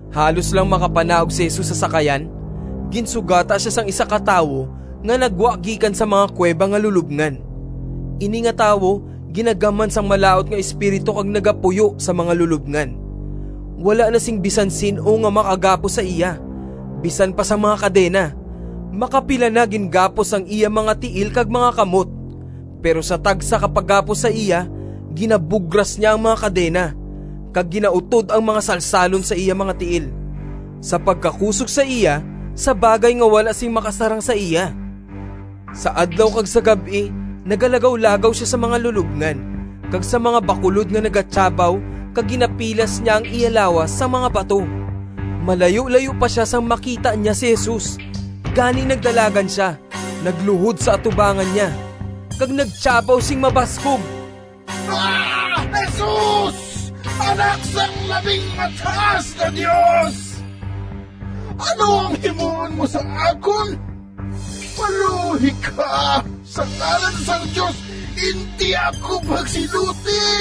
Halos lang makapanaog si Jesus sa sakayan, ginsugata sia sang isa ka tawo nga naggwa gikan sa mga kuweba nga lulobngan. Ini nga tawo ginagamhan sang malaut nga espiritu kag nagapuyo sa mga lulobngan. Wala na sing bisan sin-o nga makagapos sa iya, bisan pa sang mga kadena. Makapila na gingapos ang iya mga tiil kag mga kamot, pero sa tagsa ka paggapos sa iya, ginabugras niya ang mga kadena, kag ginautod ang mga salsalon sa iya mga tiil. Sa pagkakusog sa iya sa bagay nga wala sing makasarang sa iya. Sa adlaw kag sa gab-i nagalagawlagaw sia sa mga lulobngan kag sa mga bakulod nga nagatiyabaw kag ginapilas niya ang iya lawas sang mga bato. Malayulayo pa sia sang makita niya si Jesus, gani nagdalagan sia, nagluhod sa atubangan niya, kag nagtiyabaw sing mabaskog, “Jesus, Anak sang Labing Mataas nga Dios! Ano ang himuon mo sa akon? Maluoy ka! Sa ngalan sang Dios, indi ako pagsiluti!”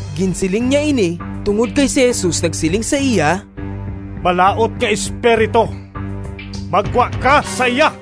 (Ginsiling niya ini tungod kay si Jesus nagsiling sa iya, “Malaut nga espiritu, maggwa ka sa iya!”)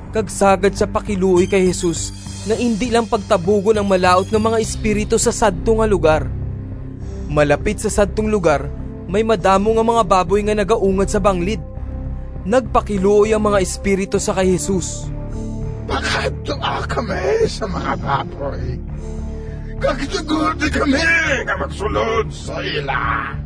Kag sagad sia pakiluoy kay Jesus nga indi lang pagtabugon ang malaut nga mga espiritu sa sadto nga lugar. Malapit sa sadtong lugar may madamo nga mga baboy nga nagaungad sa banglid. Nagpakiluoy ang mga espiritu sa kay Jesus, “Pakadtoa kami sa mga baboy, kag tugoti kami nga magsulod sa ila.”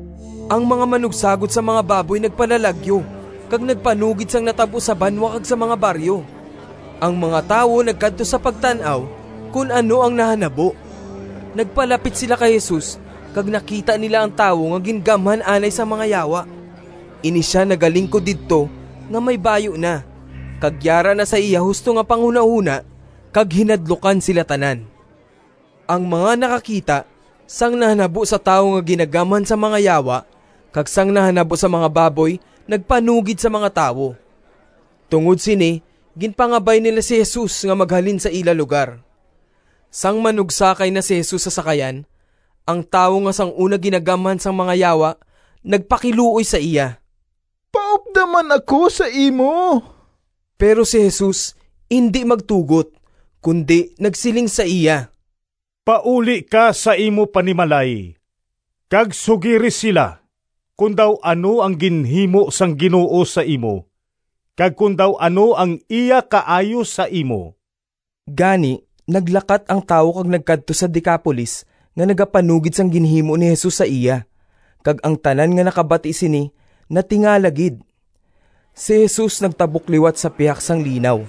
Ang mga manugsagod sang mga baboy nagpalalagyo kag nagpanugid sang natabo sa banwa kag sa mga baryo. Ang mga tawo nagkadto sa pagtan-aw kon ano ang nahanabo. Nagpalapit sila kay Jesus kag nakita nila ang tawo nga gingamhan anay sang mga yawa. Ini sia nagalingkod didto nga may bayu na, kag yara na sa iya husto nga panghunahona, kag hinadlukan sila tanan. Ang mga nakakita sang nahanabo sa tawo nga ginagamhan sang mga yawa kag sang nahanabo sa mga baboy nagpanugid sa mga tawo. Tungod sini ginpangabay nila si Jesus nga maghalin sa ila lugar. Sang manugsakay na si Jesus sa sakayan, ang tawo nga sang una gingamhan sang mga yawa nagpakiluoy sa iya: “Paupda man ako sa imo!” Pero si Jesus indi magtugot, kundi nagsiling sa iya, “Pauli ka sa imo panimalay kag sugiri sila kon daw ano ang ginhimo sang Ginoo sa imo kag kon daw ano ang iya kaayo sa imo!” Gani naglakat ang tawo kag nagkadto sa Decapolis nga nagapanugid sang ginhimo ni Jesus sa iya, kag ang tanan nga nakabati sini natingala gid. Si Jesus nagtabok liwat sa pihak sang linaw.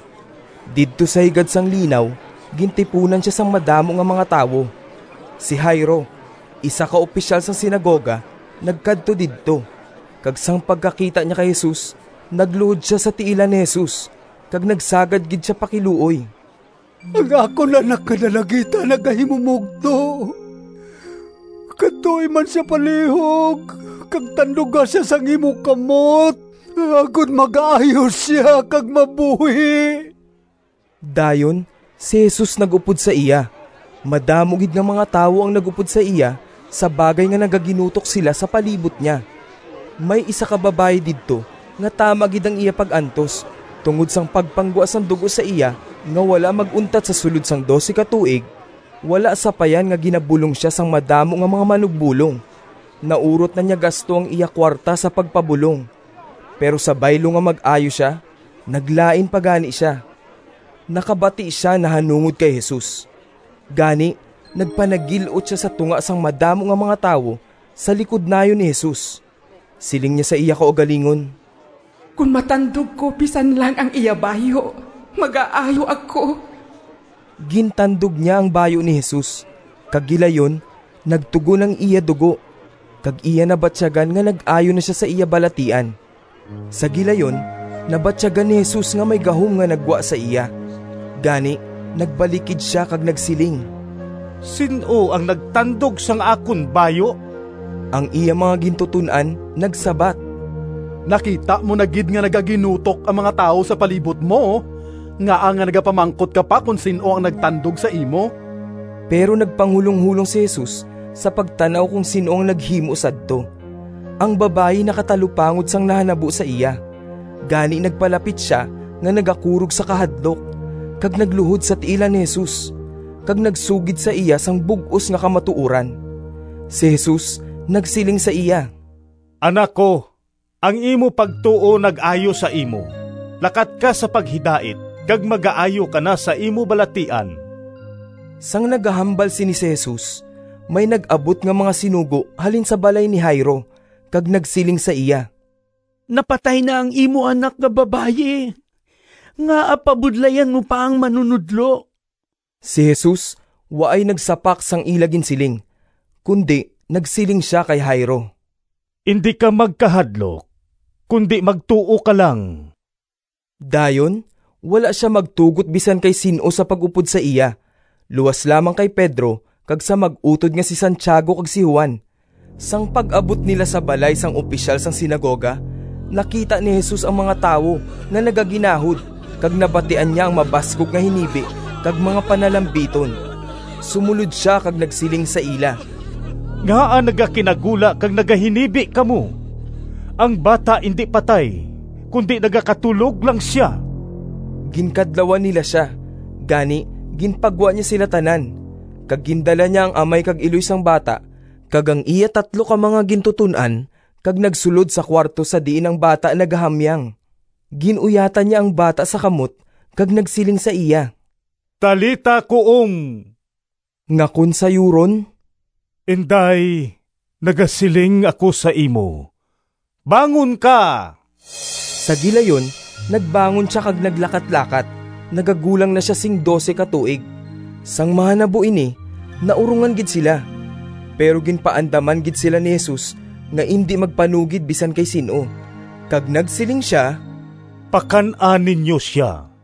Didto sa higad sang linaw gintipunan sia sang madamo nga mga tawo. Si Jairo, isa ka opisyal sang sinagoga nagkadto didto, kag sang pagkakita niya kay Jesus nagluhod sia sa tiilan ni Jesus, kag nagsagad gid sia pakiluoy: “Ang akon anak nga dalagita nagahimumogto. Kadtoi man sia palihog kag tanduga sia sang imo kamot agod magaayo sia kag mabuhi!” Dayon si Jesus nag-upod sa iya. Madamo gid nga mga tawo ang nag-upod sa iya sa bagay nga nagaginutok sila sa palibot niya. May isa ka babayi didto nga tama gid ang iya pag-antos tungod sang pagpanggwa sang dugo sa iya nga wala mag-untat sa sulod sang dose ka tuig, wala sapayan nga ginabulong sia sang madamo nga mga manugbolong. Naurot na niya gasto ang iya kuwarta sa pagpabulong, pero sa baylo nga mag-ayo sia, naglain pa gani sia. Nakabati sia nahanungod kay Jesus, gani nagpanagil-ot sia sa tunga sang madamo nga mga tawo sa likod nayon ni Jesus. Siling niya sa iya kaugalingon, “Kon matandog ko bisan lang ang iya bayu, magaayo ako.” Gintandog niya ang bayu ni Jesus, kag gilayon nagtugon ang iya dugo, kag iya nabatyagan nga nag-ayo na sia sa iya balatian. Sa gilayon nabatyagan ni Jesus nga may gahom nga naggwa sa iya. Gani nagbalikid sia kag nagsiling, “Sin-o ang nagtandog sang akon bayu?” Ang iya mga gintuton-an nagsabat, “Nakita mo na gid nga nagaginutok ang mga tawo sa palibot mo, ngaa nga nagapamangkot ka pa kon sin-o ang nagtandog sa imo?” Pero nagpanghulonghulong si Jesus sa pagtan-aw kon sin-o ang naghimo sadto. Ang babayi nakatalupangod sang nahanabo sa iya, gani nagpalapit sia nga nagakurog sa kahadlok, kag nagluhod sa tiilan ni Jesus, kag nagsugid sa iya sang bug-os nga kamatuoran. Si Jesus nagsiling sa iya, “Anak ko, ang imo pagtuo nag-ayo sa imo. Lakat ka sa paghidait, kag magaayo ka na sa imo balatian.” Sang nagahambal sini si Jesus, may nag-abot nga mga sinugo halin sa balay ni Jairo, kag nagsiling sa iya, “Napatay na ang imo anak nga babayi. Ngaa pabudlayan mo pa ang Manunodlo?” Si Jesus waay nagsapak sang ila ginsiling, kundi nagsiling sia kay Jairo, “Indi ka magkahadlok, kundi magtuo ka lang.” Dayon wala sia magtugot bisan kay sin-o sa pag-upod sa iya luas lamang kay Pedro kag sa mag-utod nga si Santiago kag si Juan. Sang pag-abot nila sa balay sang opisyal sang sinagoga, nakita ni Jesus ang mga tawo nga nagaginahod, kag nabatian niya ang mabaskog nga hinibi kag mga panalabiton. Sumolod sia kag nagsiling sa ila, “Ngaa nagakinagula kag nagahinibi kamo? Ang bata indi patay, kundi nagakatulog lang sia!” Ginkadlawan nila sia, gani ginpagwa niya sila tanan, kag gindala niya ang amay kag iloy sang bata kag ang iya tatlo ka mga gintuton-an, kag nagsulod sa kuwarto sa diin ang bata nagahamyang. Gin-uyatan niya ang bata sa kamot kag nagsiling sa iya, “Talitha, koum,” nga kon sayuron, “Inday, nagasiling ako sa imo, bangon ka!” Sa gilayon nagbangon sia kag naglakatlakat. (Nagagulang na sia sing dose ka tuig.) Sang mahanabo ini, naurongan gid sila! Pero ginpaandaman gid sila ni Jesus nga indi magpanugid bisan kay sin-o. Kag nagsiling sia, “Pakan-a ninyo sia.”